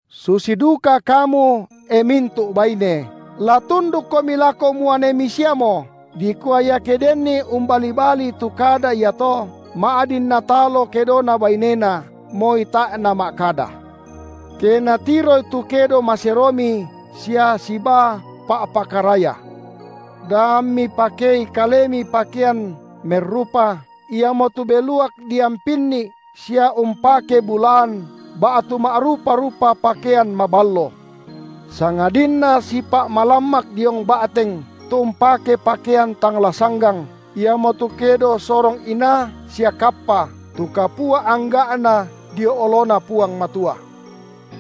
Susi duka kamu, e mintu’ baine, la tundukkomi lako muanemi siamo, dikua iake denni umbali-balii tu kada iato, ma’din natalo kedona bainena, moi tae’ nama’kada, ke natiroi tu kedo maseromi sia sibaa pa’pakaraya. Da ammi pakei kalemi pakean merrupa, iamotu beluak diampinni’ sia umpake bulaan, ba’tu ma’rupa-rupa pakean maballo, sangadinna sipa’ malammak diong ba’teng, tu umpake pakean tang la sanggang, iamotu kedo sorong inaa sia kappa, tu kapua angga’na dio oloNa Puang Matua.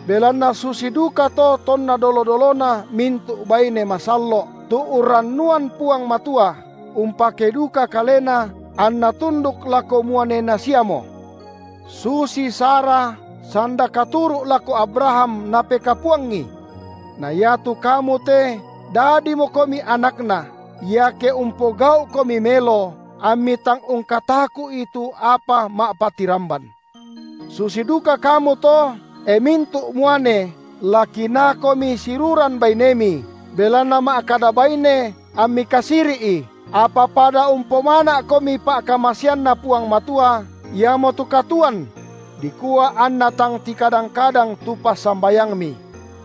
Belanna susi dukato tonna dolo-dolona mintu’ baine masallo’, tu urrannuan Puang Matua, umpakei duka kalena, anna tunduk lako muanena siamo, susi Sara sanda katuru’ lako Abraham napekapuangi. Na iatu kamu te dadimokomi anakna, iake umpogau’komi melo, ammi tang ungkataku’i tu apa ma’patiramban. Susi duka kamu to, e mintu’ muane la kinaakomi siruran bainemi, belanna ma’kada baine, ammi kasiri’i, apa pada umpomana’komi pa’kamaseanNa Puang Matua, iamotu katuoan: dikua anna tang tikadang-kadang tu passambayangmi.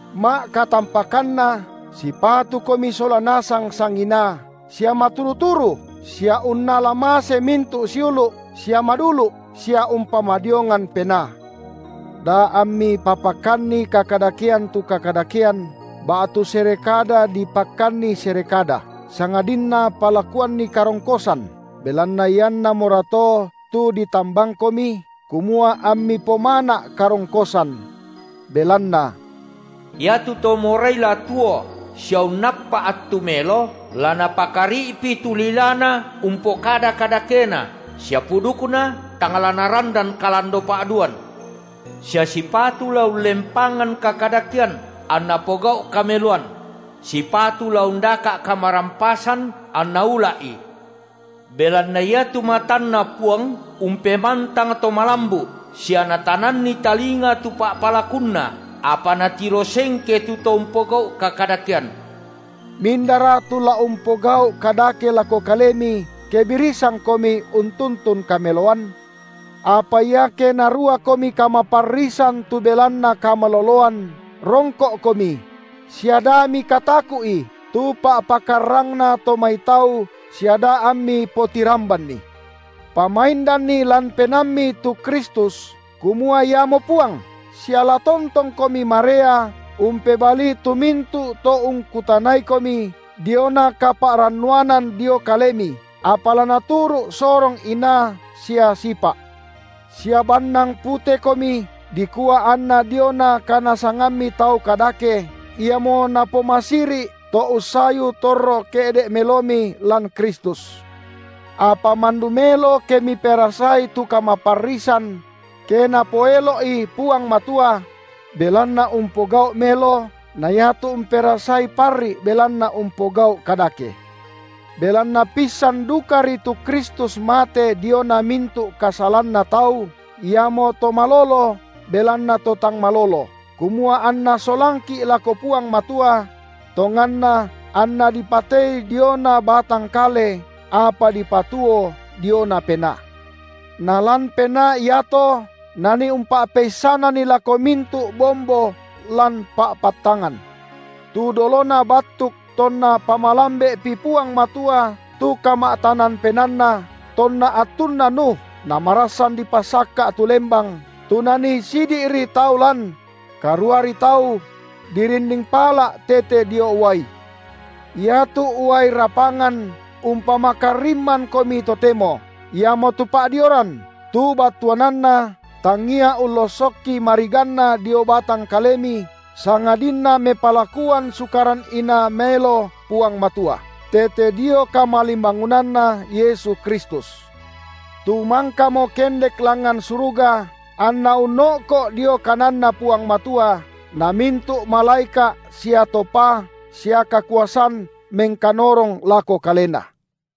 Ma’katampakanna sipatukomi sola nasang sanginaa, sia maturu-turu, sia unnala mase mintu’ siulu’, sia madulu’, sia umpamadiongan penaa; da ammi papakkanni kakadakean tu kakadakean, ba’tu sere kada dipakkanni sere kada, sangadinna palakuanni karongkosan, belanna iannamorato tu ditambangkomi, kumua ammi pomana’ karongkosan. Belanna: Iatu to morai la tuo sia unnappa’ attu melo, la napakari’pi tu lilana umpokada kadakena, sia pudukna, tang la narandan kalandopa’duan; sia sipatu la ullempangan kakadakean, anna pogau’ kameloan; sipatu la undaka’ kamarampasan anna ula’i; belanna iatu matanNa Puang umpemantang to malambu’ sia Natananni talinga tu pa’palakunna, apa Natiro sengke tu to umpogau’ kakadakean. Mindara tu la umpogau’ kadake lako kalemi ke birisankomi untuntun kameloan? Apa iake naruakomi kamaparrisan tu belanna kamaloloan, rongko’komi; sia da mikataku’i tu pa’pakarrangna to mai tau sia da ammi potirambanni. Pamaindanni lan penaammi tu Kristus kumua iamo Puang, sia la tontongkomi marea umpebalii tu mintu’ to ungkutanaikomi diona kapa’rannuanan dio kalemi, apa la naturu’ sorong inaa sia sipa’, sia bannang putekomi, dikua anna diona kanasangammi tau kadake, iamo napomasiri’ to ussayu torro ke’de’ melomi lan Kristus. Apa mandu melo ke miperasai tu kamaparrisan, – ke Napoelo’i Puang Matua –, belanna umpogau’ melo na iatu umperasai parri’ belanna umpogau’ kadake. Belanna pissan dukari tu Kristus mate diona mintu’ kasalanna tau, Iamo To malolo belanna to tang malolo, kumua anNa solangki’ lako Puang Matua; tonganna anNa dipatei diona batang kale, apa dipatuo diona penaa. Nalan penaa iato Nanii umpa’peissananni lako mintu’ bombo lan pa’pattangan, tu dolona battuk tonna pamalambe’pi Puang Matua tu kama’tanan penaanNa, tonna attunna Nuh, namarassan dipasakka’ tu lembang, tu nanii sidi’ri tau lan – karuari tau – dirinding pala’ tete dio uai. Iatu uai rapangan umpamakarimmankomi totemo, iamotu pa’dioran, tu battuananna tangia ullossokki mariganna dio batang kalemi, sangadinna mepalakuan sukaran inaa maelo Puang Matua, tete dio kamalimbangunanNa Yesu Kristus, tu mangkamo kendek langngan suruga, anNa unno’ko’ dio kananNa Puang Matua, na mintu’ malaeka’ sia to paa sia kakuasan mengkanorong lako Kalena.